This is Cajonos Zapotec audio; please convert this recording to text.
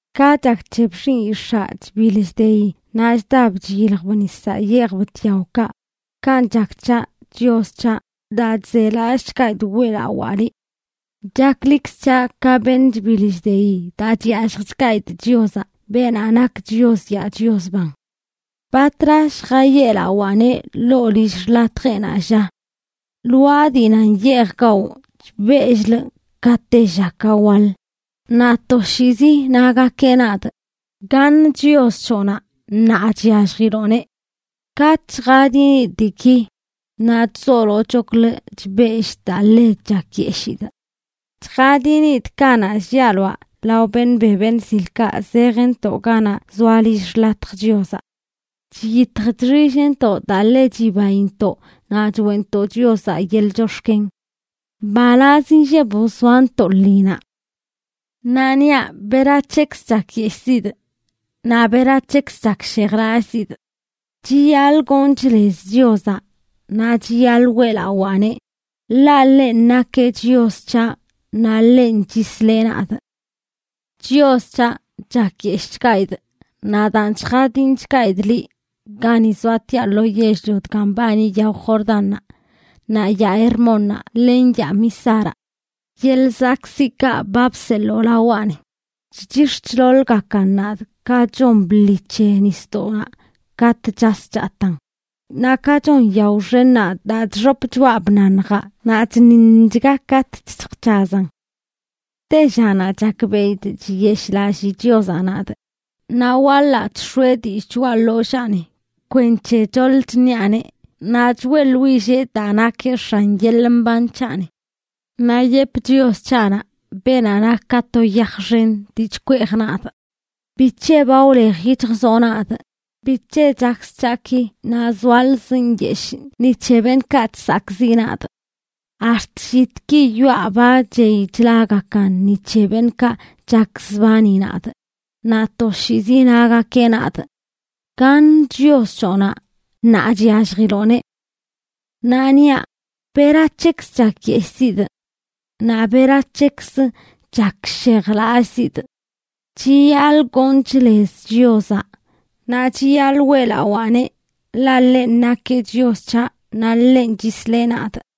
Ka chak c̱he bllinꞌyix̱aa chbiḻ chdeyi naꞌ chdab chyiljb nisaꞌ yeejb tyaokaꞌ, kanꞌ chak c̱haꞌ, Chios c̱haꞌ, daa chzelallꞌchgaidꞌ weꞌlawaa liꞌ. Chaklikz c̱haꞌ ka beṉꞌ chbiḻ chdeyi daa chyalljchgaidꞌ Chiozaꞌ, beenaꞌ nak Chios yaa Chios ban. ¿Batra lljayeꞌlawaaneꞌ ḻoo lill xḻatjeꞌnaꞌ, lla? Lwaa dii nan yeej gawꞌ, chbell-lꞌ ka tella ka waḻ, naꞌ toshiizi nagakeꞌ nadꞌ: “¿Gaṉ Chios c̱hoꞌnaꞌ, ṉaa chyalljiloꞌneꞌ?” Katꞌ chjadinidꞌ diiki, naꞌ chzolochoklə chbellꞌ daa ḻe chakyeshidꞌ. Chjadinidꞌ kanaꞌ llialoaꞌ lao beṉꞌ be beṉꞌ zilkaꞌ zejntoꞌ ganaꞌ zoa lill xḻatj Chiozaꞌ. Chyitj chxillntoꞌ daa ḻe chibaintoꞌ naꞌ choeꞌntoꞌ Chiozaꞌ yeḻꞌ chox̱ken. ¡Mbalaz inlleb wzoantoꞌ lṉinaꞌ! Naꞌ niaꞌ: ¿Berac̱hekzə chakyeshꞌzidꞌ? Naꞌ ¿Berac̱hekzə chakshejlallꞌzidꞌ? Chiyaḻꞌ gonchꞌ lez Chiozaꞌ, naꞌ chiyaḻꞌ weꞌlawaaneꞌ, ḻaꞌ ḻenꞌ nakeꞌ Chios c̱haꞌ, naꞌ ḻenꞌ chisleꞌ nadꞌ. Chios c̱haꞌ, chakyeshꞌchgaidꞌ. Naꞌ daan, chjadinchgaidꞌ liꞌ gani zoatiaꞌ lo yell-lio dga mbani yao Jordánnaꞌ, naꞌ yaa Hermónnaꞌ len yaa Mizaraꞌ. Yeḻꞌ zakꞌziꞌkaꞌ ba bseḻoo lawaꞌni chchix̱ chḻoḻgakan nadꞌ ka chon bḻi c̱he nisdoꞌnaꞌ katꞌ chas chataan, naꞌ ka chon yao xennaꞌ daa chxop choꞌa bnaṉjaꞌ naꞌ chṉiṉchga katꞌ chjc̱hazan. Tellanaꞌ chakbeꞌidꞌ chiyeshꞌlallii Chiozaꞌ nadꞌ, naꞌ waḻaꞌ chx̱oeꞌ dillꞌ choꞌa ḻollaani kwenc̱he choḻ chṉiaꞌneꞌ, naꞌ choeꞌḻwillee daa nakeꞌ X̱an yeḻꞌ mban c̱haꞌni. Naꞌ yepꞌ Chios c̱haꞌnaꞌ, beenaꞌ nak ka to yaj xen dii chkweej nadꞌ: “¿Bic̱he ba wlej yic̱hjzoꞌ nadꞌ? ¿Bic̱he chakz c̱haꞌ ki, naꞌ zoalzꞌ nyeshꞌ ni c̱he beṉꞌkaꞌ chsakꞌziꞌ nadꞌ?” Ax̱t llitki yoꞌa ba chey chlagakan ni c̱he beṉꞌkaꞌ chakzbani nadꞌ, naꞌ toshiizi nagakeꞌ nadꞌ: “¿Gaṉ Chios c̱hoꞌnaꞌ, ṉaa chyalljiloꞌneꞌ?” Naꞌ niaꞌ: ¿Berac̱hekzə chakyeshꞌzidꞌ? Naꞌ ¿berac̱hekzə chakshejlallꞌzidꞌ? Chiyaḻꞌ gonchꞌ lez Chiozaꞌ, naꞌ chiyaḻꞌ weꞌlawaaneꞌ, ḻaꞌ ḻenꞌ nakeꞌ Chios c̱haꞌ naꞌ ḻenꞌ chisleꞌ nadꞌ.